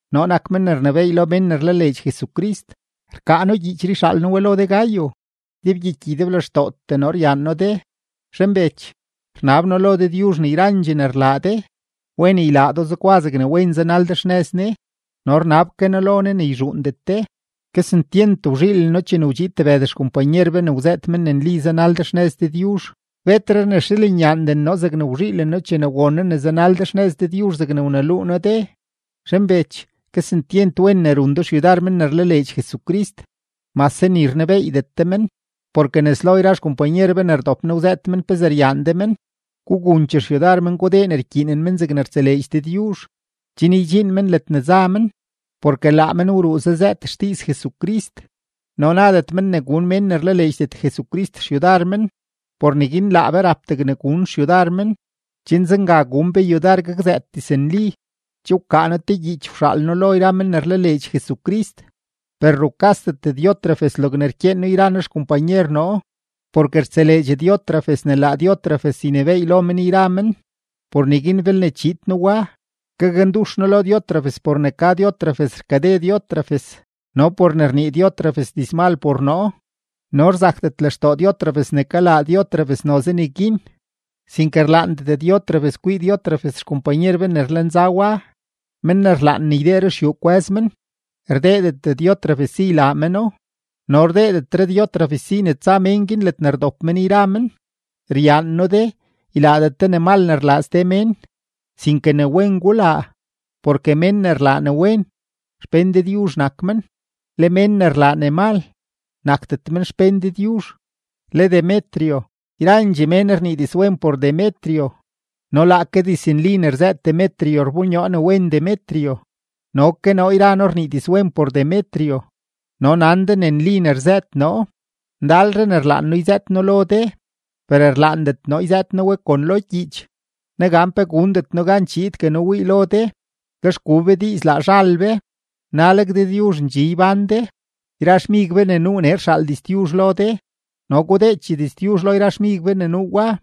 Noo nak men ne rnebééy lo mén ne rlaleedx Jesucrist. Rkaa noo gyiichree yxaal noo we lo de Gayo; ydebgyiky ydeblextootee noo ryaan noo de. Zhanbech, rnab noo lo Dëdyuzh ne yrandxee ne rlaa de, wen ylaa do zegwa zegne wen zanal de xnëz Ne no rnab ke noo lo Ne ne yzhuundet de. Kesentyent wzhiilen noo chene wdxiid tebëd xkompanyer be ne wzëët men ne nli zanal de xnëz Dëdyuzh. Betre rnexiilenyaanden noo zegne wzhiilen noo chene won noo ne zanal de xnëz Dëdyuzh zegne wneluu noo de. Zhanbech, kesentyent wen ne run de xyudar men ne rlaleedx Jesucrist, mase ni rnebeeydet de men. Porke nes lo yra xkompanyer be ne rdop nee, wzëët men pezee ryaan de men. Gugunchee xyudar men gudee ne ykyiinen men zegne rtseleedx Dëdyuzh, chen ydxiin men ledne za men. Porke laa men wruu zazëët xdiiz Jesucrist no nadet men ne gun mén ne rlaleedxdet Jesucrist xyudar men. Por neguin laa be rap degne gun xyudar men, chen zenga gun be yudar gakzëët diznli. Che wkaa noo te gyiich wxaal noo lo yra men ne rlaleedx Jesucrist, per rukasdet Diótrefes logne rkyeen noo yra noo xkompanyer noo, porke rtseleedx Diótrefes ne laa Diótrefes ynebééy lo men yra men. Por neguin belne chiid noo wa, gakndux noo lo Diótrefes por ne ka Diótrefes rkade Diótrefes no por ne rnii Diótrefes dizmal por noo, no rzakdet lextoo Diótrefes ne kalaa Diótrefes noze neguin, sinke rlaandet Diótrefes kwii Diótrefes xkompanyer be ne rlenza wa. Men ne rlaan ne ydee ruxyuu kwë́z men, rdeedet Diótrefes si ylaa meno no rdeedetre Diótrefes si ne tsa men guin ledne rdop men yra men. Ryaan noo de, ylaadet de ne mal ne rlaa ste mén, sinke ne wen gulaa, porke mén ne rlaa ne wen, xpén Dëdyuzh nak men; le mén ne rlaa ne mal, nakdet men xpén Dëdyuzh. Le Demetrio, yrandxee mén rnii dizwen por Demetrio, no laake diznli ne rzëët Demetrio rbonyoo ne wen Demetrio, no ke noo yra noo rnii dizwen por Demetrio, no nan de ne nli ne rzëët noo. Ndalre ne rlaan noo yzëët noo lo de, per rlaandet noo yzëët noo we kon lo gyiich. Negan pe gundet noo gan chiidgue noo wii lo de, lex gu be diiz laa zhal be. Naleg Dëdyuzh ndxi ybán de. Yra xmig be ne nuu nee rxaal diztyuzh lo de, no gudeechee diztyuzh lo yra xmig be ne nuu wa.